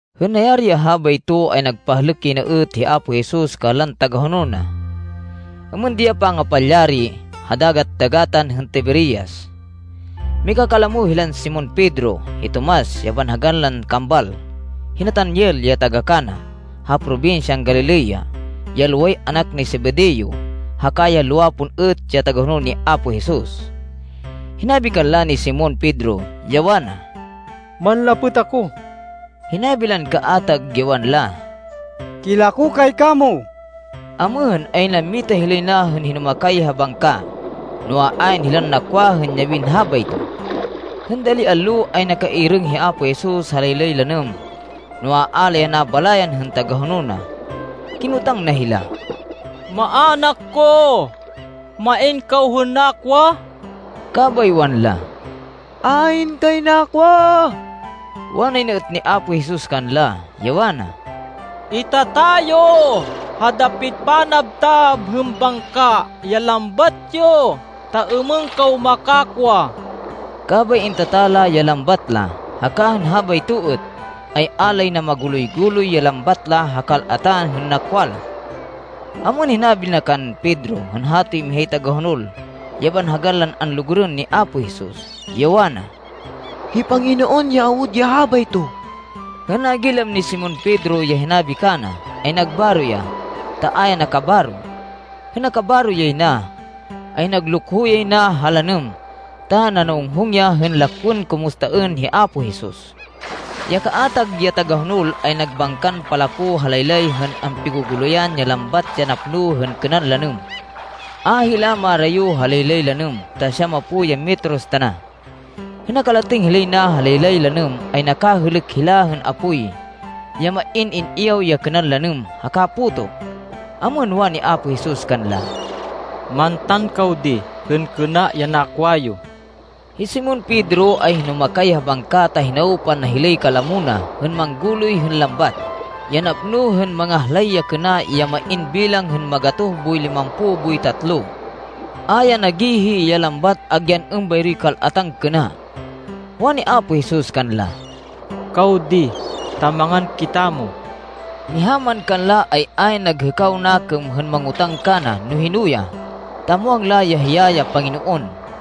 Hên nayari ya habayto, ay nagpahlêk yay na êt hi Apo Jesus kanlan tagahonol na. Êmên di ya pangapalyari ha Dagat-dagatan hên Tiberias. Mikakalamo hilan Simon Pedro, hi Tomas ya banhagan lan Kambal, hi Natanael ya taga-Cana, ha probinsyan Galilea, ya loway anak ni Zebedeo, haka ya lowa pon êt ya tagahonol ni Apo Jesus. Hinabi kanla ni Simon Pedro, ya wana, “Manlapêt ako.” Hinabi lan kaatag, ya wanla, “Kilako kay kamo.” Amêhên, ay nammita hilay na hên hinumakay ha bangka, noa, ayn hilan nakwa hên yabin habayto. Hên dali allo, ay nakairêng hi Apo Jesus ha laylay lanêm, noa, a la ya nabalayan hên tagahonol na. Kinotang na hila, “Maanak ko, main kaw hên nakwa?” Kabay wanla, “Ayn kay nakwa.” Wanay na êt ni Apo Jesus kanla, ya wana, “Itata yo ha dapit panabtab hên bangka ya lambat yo ta êmên kaw makakwa.” Kabay intata la ya lambat la, haka hên habayto êt, ay a lay na maguloy-guloy ya lambat la ha kal-atan hên nakwa la. Amêhên, hinabi na kan Pedro hên hatoy mihay tagahonol, ya banhagan lan anlugurên ni Apo Jesus, ya wana, “Hi Panginoon ya awud ya habayto!” Hên nagilam ni Simon Pedro ya hinabi kana, ay nagbaro ya, ta a ya nakabaro. Hên nakabaro yay na, ay naglukho yay na ha lanêm ta nanawonghong ya hên lakwên kumustaên hi Apo Jesus. Ya kaatag ya tagahonol, ay nagbangkan palako ha laylay hên ampigu-guluyan ya lambat ya napno hên kênan lanêm. A hila marayo ha laylay lanêm ta siyamapo ya metros tana. Hên nakalatêng hilay na ha laylay lanêm ay nakahêlêk hila hên apoy, ya main in-iyaw ya kênan lanêm haka puto. Amêhên, wani Apo Jesus kanla, “Mantan kaw di hên kêna ya nakwa yo.” Hi Simon Pedro ay hinumakay ha bangka ta hinawpan na hilay kalamo na hên mangguloy hên lambat, ya napno hên mangahlay ya kêna ya main bilang hên magatoh boy limampo boy tatlo. A ya nagihi ya lambat agyan êmbayroy kal-atan kêna. Wani Apo Jesus kanla, “Kaw di, ta mangan kitamo.” Miha man kanla, ay ayn naghêkaw nakêm hên mangotáng kana no hino ya, ta muwang la ya hiya ya Panginoon.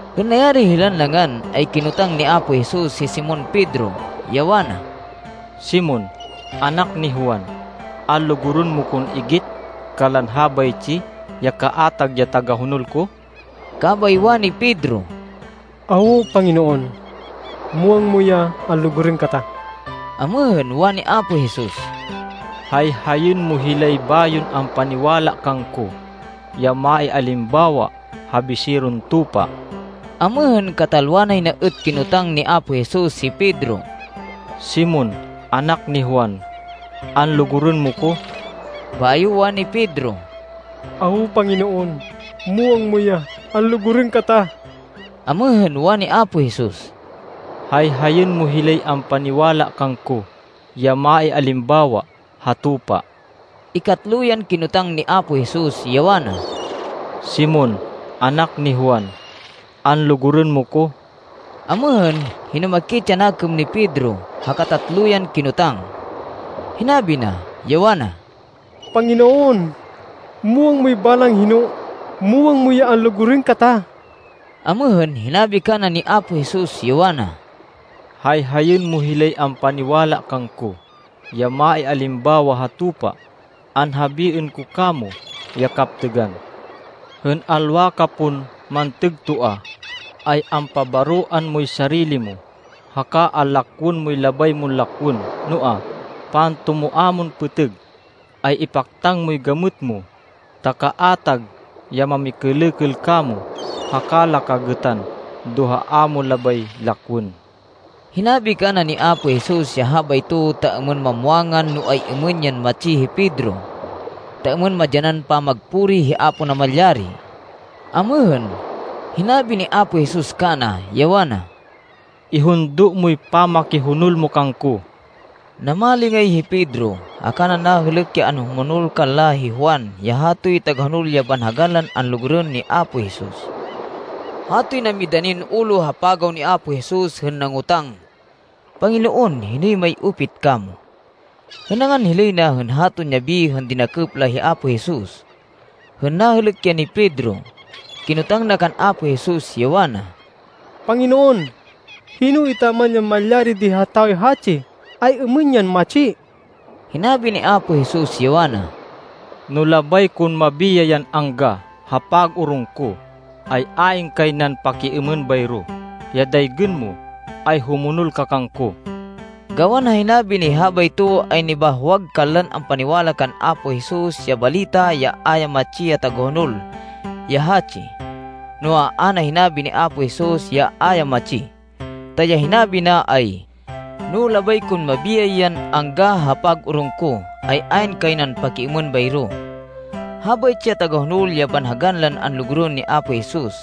Hên nayari hilan nangan, ay kinotang ni Apo Jesus hi Simon Pedro, ya wana, “Simon, anak ni Juan, anlugurên mo kon igit kanlan habaytsi ya kaatag ya tagahonol ko?” Kabay wani Pedro, “Awo, Panginoon. Muwang mo ya anlugurên kata.” Amêhên, wani Apo Jesus, “Hayhayên mo hilay bayon ampaniwala kangko, ya maialimbawa ha biseron tupa.” Amêhên, katalwa nay na êt kinotang ni Apo Jesus hi Pedro, “Simon, anak ni Juan, anlugurên mo ko?” Bayo wani Pedro, “Awo, Panginoon. Muwang mo ya anlugurên kata.” Amêhên, wani Apo Jesus, “Hayhayên mo hilay ampaniwala kangko, ya maialimbawa ha tupa.” Ikatlo yan kinotang ni Apo Jesus, ya wana, “Simon, anak ni Juan, anlugurên mo ko?” Amêhên, hinumakit ya nakêm ni Pedro ha katatlo yan kinotang. Hinabi na, ya wana, “Panginoon, muwang moy balang hino. Muwang mo ya anlugurên kata.” Amêhên, hinabi kana ni Apo Jesus, ya wana, “Hayhayên mo hilay ampaniwala kangko, ya maialimbawa ha tupa. Anhabiên ko kamo ya kaptêgan. Hên alwa ka pon mantêg toa, ay ampabaroan moy sarili mo, haka anlakwên moy labay mon lakwên. Noa, pantumoa mon pêtêg, ay ipaktang moy gamêt mo ta kaatag ya mamikêlêkêl kamo, haka la ka gêtan do ha a mo labay lakwên.” Hinabi kana ni Apo Jesus ya habayto, ta êmên mamwangan no ay-êmên yan matsi hi Pedro, ta êmên madyanan pamagpuri hi Apo Namalyari. Amêhên, hinabi ni Apo Jesus kana, ya wana, “Ihundo moy pamakihonol mo kangko.” Namalingay hi Pedro, haka na nahêlêk ya anhumonol kanla hi Juan, ya hatoy tagahonol ya banhagan lan anlugurên ni Apo Jesus. Hatoy namidanin ulo ha pagaw ni Apo Jesus hên nangotang, “Panginoon, hinoy may-upit kamo?” hên nangan hilay na hên haton yabi hên dinakêp la hi Apo Jesus. Hên nahêlêk ya ni Pedro, kinotang na kan Apo Jesus, ya wana, “Panginoon, hino etaman ya malyari di ha tawoy hatsi? Ay-êmên yan matsi?” Hinabi ni Apo Jesus ya wana, “No labay kon mabiyay yan angga ha pag-orong ko, ay ayn kay nan pakiêmên bayro. Ya daygên mo, ay humonol ka kangko.” Gawan ha hinabi nay habayto, ay nibahwag kanlan ampaniwala kan Apo Jesus ya balita ya a ya matsi ya tagahonol ya hatsi. Noa, a na hinabi ni Apo Jesus, ya a ya matsi. Ta, ya hinabi na ay, “No labay kon mabiyay yan angga ha pag-orong ko, ay ayn kay nan pakiêmên bayro.” Habaytsi ya tagahonol ya banhagan lan anlugurên ni Apo Jesus,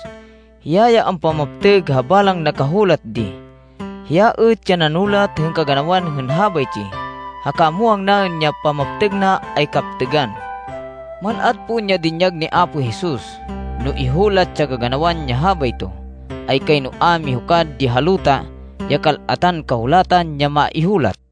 hiya ya ampamaptêg ha balang nakahulat di. Hiya êt ya nanulat hên kaganawan hên habaytsi, haka muwang naên ya pamaptêg na ay kaptêgan. Mal-at pon ya dinyag ni Apo Jesus. No ihulat ya kaganawan ya habayto, ay kayno a mihukad di ha luta ya kal-atan kahulatan ya maihulat.